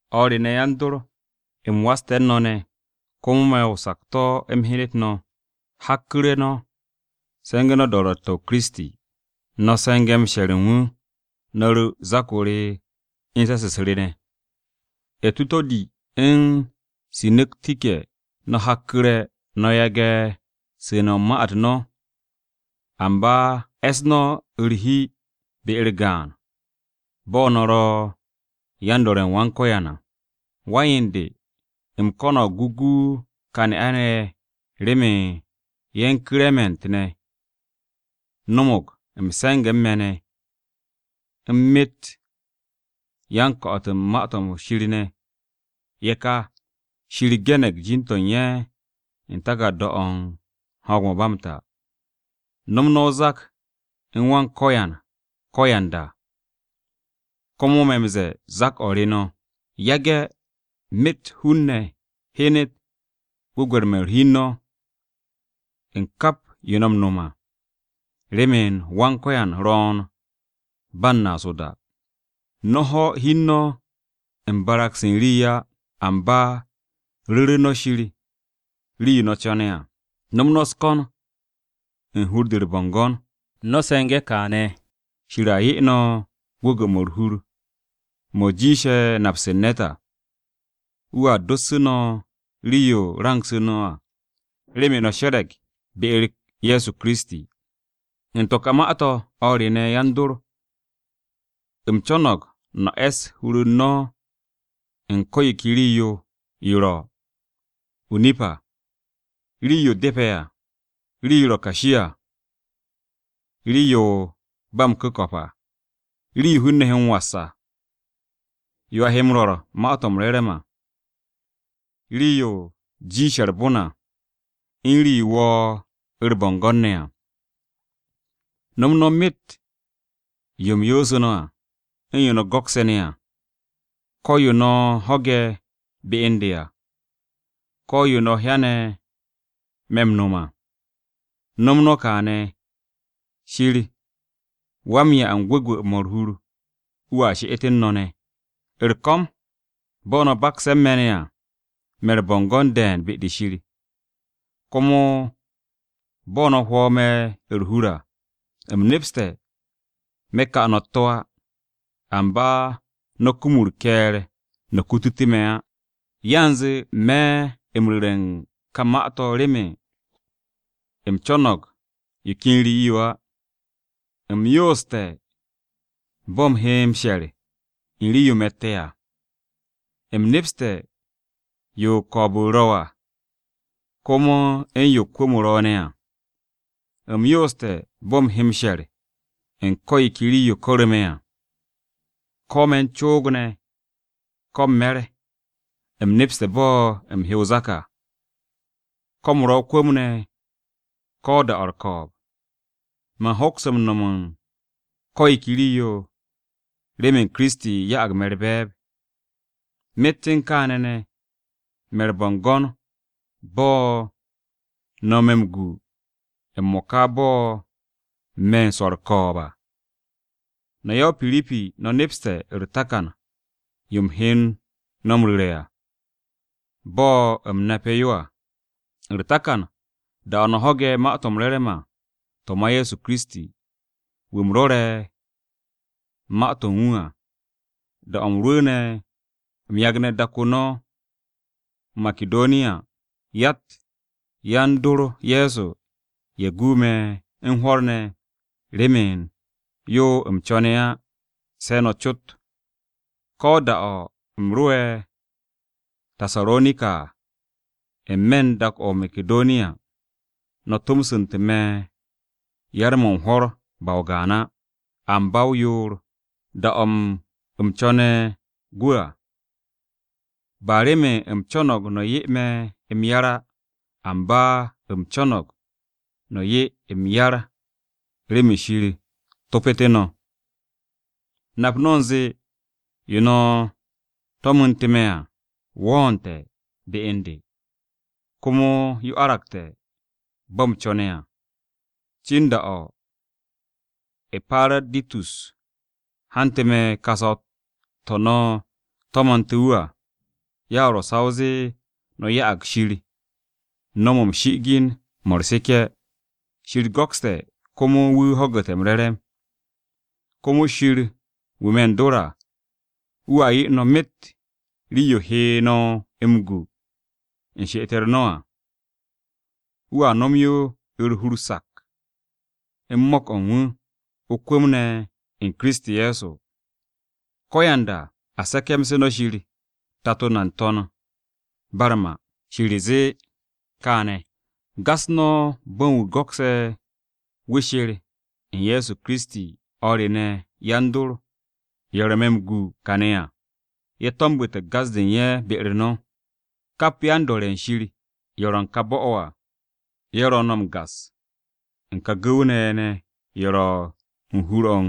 O̱r re ne̱, yan-dor, u̱m waste̱ u̱n no̱ ne̱, komo me̱ o-sakto̱ m-hyenet no̱, hakku̱re̱ no̱ se̱ngu̱ no̱ o-do̱ro̱tte̱ u̱n Wan-Ko̱yan, no̱ se̱nge̱ m-she̱r u̱n wu̱, no̱ ru̱ me̱ o-zak, u̱n se̱s-u̱s ne̱. Etuto̱di u̱n Sinu̱tike no̱ hakku̱re̱ no̱ yage̱ m-su̱u̱ne̱ u̱n ma-u̱t no̱, amba e̱ss no̱ u̱r-hi be-u̱r gaan, bo̱ no̱ ro̱ yan-do̱re̱ u̱n Wan-Ko̱yan à. Wan-yen de, u̱m ko̱no̱g o gu ka ne'a-ne̱ ye̱, remen ye̱ u̱n Ku̱rement ne̱, no̱mo̱g m-se̱nge̱ u̱n me̱ ne̱, u̱n myet u̱n yan-ko̱'o̱t u̱n Ma-to̱ m-Re̱re̱m ne̱, ye̱ ka, Shir ge̱ne̱g jin-to̱ u̱n ye̱ u̱n taku̱rda-o̱ u̱n ho̱o̱g-mo̱ ba m-ta. No̱m no̱ o-zak u̱n Wan-Ko̱yan ko̱yanda, komo me̱ no̱ m-ze̱e̱ zak-o̱ re̱ no̱. Yage̱ myet hun-ne̱ hyen gwu̱gwe̱r-mo̱ u̱r-hi u̱n no̱, u̱n kap yo no̱ m-no̱m à, remen Wan-Ko̱yan ro̱o̱n ba u̱n naas o-da. No̱ ho̱ hi u̱n no̱ u̱n barag-se u̱n rii á. Amba ru̱ru̱ no̱ Shir rii-yo no̱ co̱ne̱ à, no̱m no̱ u̱s-ko̱n u̱n hur-de u̱r-bo̱ngo̱n. No̱ se̱nge̱ kaane̱, Shir a 'ye no̱ gwu̱gwu̱-mo̱ u̱r-hur, mo̱ jiishe̱ napse̱ u̱n ne̱t à. Wu̱a dossu̱ no̱ rii-yo rangsu̱ no̱ à, remen no̱ she̱re̱g be-u̱r Ye̱so Kiristi. U̱n to̱ ka ma-to̱, o̱r re ne̱, yan-dor, u̱m co̱no̱g no̱ e̱ss hur-u̱t no̱ u̱n ko̱ yo ke rii-yo ro̱: o-nip à, rii-yo depe̱ à, rii-yo ro̱ kashi à, rii-yo ro̱ ba m-ku̱ko̱p à, rii-yo hun-ne̱ he m-was à, yo a he m-rwo̱r Ma-to̱ m-Re̱re̱m à, rii-yo jiishe̱ u̱r-bon à, u̱n rii-yo wo̱o̱ u̱r-bo̱ngo̱n ne̱ à. No̱m no̱ myet yo u̱m yoosu̱ no̱ à, u̱n yo no̱ go̱kse̱ ne̱ à. Ko̱ yo no̱ ho̱ge̱ be u̱n de à, ko̱ yo no̱ hyane̱ me̱ m-no̱m à. No̱m no̱ go̱n kaane̱, Shir wa-m-'ya u̱n gwu̱gwu̱-mo̱ u̱r-hur, wu̱a she'et u̱n no̱ ne̱. U̱r-ko̱m, bo̱ no̱ bakse̱ u̱n me̱ ne̱ à, me̱ u̱r-bo̱ngo̱n de̱e̱n be-de Shir. Komo bo̱ no̱ hwo̱ me̱ u̱r-hur à, u̱m nepste̱ me̱ ka no̱ u̱t-to̱ á. Amba no̱ kum u̱r-ke̱e̱r no̱ kutute̱ me̱ á. Yanze me̱ no̱ u̱m ru̱re̱ u̱n ka ma-to̱ remen u̱m co̱no̱g yo ken rii-yo á. U̱m yooste̱ bo̱ u̱m he m-she̱r u̱n rii-yo u̱m ro̱tte̱ à. U̱m nepste̱ yo ko̱o̱b-u̱r ro̱ à, komo u̱n yo kwu̱m-o ro̱ ne̱ à, u̱m yooste̱ bo̱ u̱m he m-she̱r u̱n ko̱ yo ke rii-yo ko̱ru̱ me̱ à, ko me̱ u̱n coog ne̱ ko̱ m-me̱r, u̱m nepste̱ bo̱ u̱m he o-zak à, ko̱ u̱m ro̱ o-kwu̱m ne̱ ko̱ da-o̱ u̱r-ko̱o̱b. Man hoks m-no̱m u̱n ko̱ yo ke rii-yo, remen Kiristi, ya'ag me̱ u̱r-be̱e̱b. Myet u̱n kaane̱ ne̱, me̱ u̱r-bo̱ngo̱n bo̱ no̱ me̱ m-gu m-mo̱ka bo̱ me̱ u̱n swo̱ u̱r-ko̱o̱b à. No̱ ya-o-Piripi no̱ nepste̱ u̱r-takan yo u̱m he no̱ m-ru̱re̱ à, bo̱ u̱m nape̱ yo à. U̱r-takan, da-o̱ no̱ ho̱ge̱ Ma-to̱ m-Re̱re̱m à, to̱ ma Ye̱so Kiristi, wu̱ u̱m rwo̱re̱ ma-to̱ u̱n wu̱ à, da-o̱ u̱m rwu̱u̱ne̱ u̱m yagne̱ dak-o no̱ o-Makidoniya, yatt yan-dor Ye̱so ye̱ gu me̱ u̱n hwo̱r ne̱ remen yo u̱m co̱ne̱ á, se no̱ cot. Ko̱ da-o̱ u̱m ro'e̱ o-Tasaronika, n-me̱ u̱n dak-o̱ o-Makidoniya, no̱ tomsu̱nte̱ me̱ yar-mo̱ u̱n hwo̱r ba o-gaan á, amba o-yoor, da-o̱ u̱m co̱ne̱ gwu̱ à. Ba remen u̱m co̱no̱g no̱ 'ye me̱ m-yar á, amba u̱m co̱no̱g no̱ 'ye m-yar remen Shir topo̱té̱ no̱. Nap no̱ u̱nze yo no̱ to̱mnu̱nte̱ me̱ à wo̱o̱nte̱ be u̱n de, komo yo aragte̱ bo̱ u̱m co̱ne̱ à, cin da-o̱ E̱paraditus hante̱ me̱ ka saw-to̱ no̱ to̱mo̱nte̱ wu̱ à. Ya ro̱ sa o zee no̱ ya'ag Shir no̱w-mo̱ m-shi'igin, mo̱ u̱r-seke̱, Shir go̱kste̱, komo wu̱ ho̱gu̱te̱ m-re̱re̱m. Komo Shir wu̱ me̱ u̱n dor à, wu̱a 'ye no̱ myet rii-yo he no̱ m-gu u̱n she'et-u̱r no̱ à. Wu̱a no̱m yo u̱r-hur sak u̱n mo̱k-o̱ u̱n wu̱, o-kwu̱m ne̱ u̱n Kiristi, Ye̱so. Ko̱yanda, a se̱ke̱mse̱ no̱ Shir, Tato na n-To̱n ba u̱r-ma. Shir zee kaane̱! Gas no̱ bo̱ u̱n wu̱ go̱kse̱ wu̱ sher u̱n Ye̱so Kiristi à. O̱r re ne̱, yan-dor, ye̱ ro̱ me̱ m-gu kaane̱ à, ye̱ to̱mbu̱te̱ gas-de u̱n ye̱ be-u̱r no̱. Kap yan-dor ye̱ Shir, ye̱ ro̱ u̱n ka bo̱-o̱ à, ye̱ ro̱ no̱ m-gas u̱n ka gu̱w-ne̱ ye̱ ne̱, ye̱ ro̱ u̱n hur-o̱ u̱n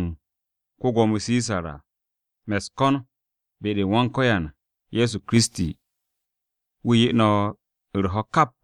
ko-Gwo̱mo Sisar à. Me̱ u̱s-ko̱n be-u̱r Wan-Ko̱yan Ye̱so Kiristi, wu̱ 'ye no̱ u̱r-ho̱ kap.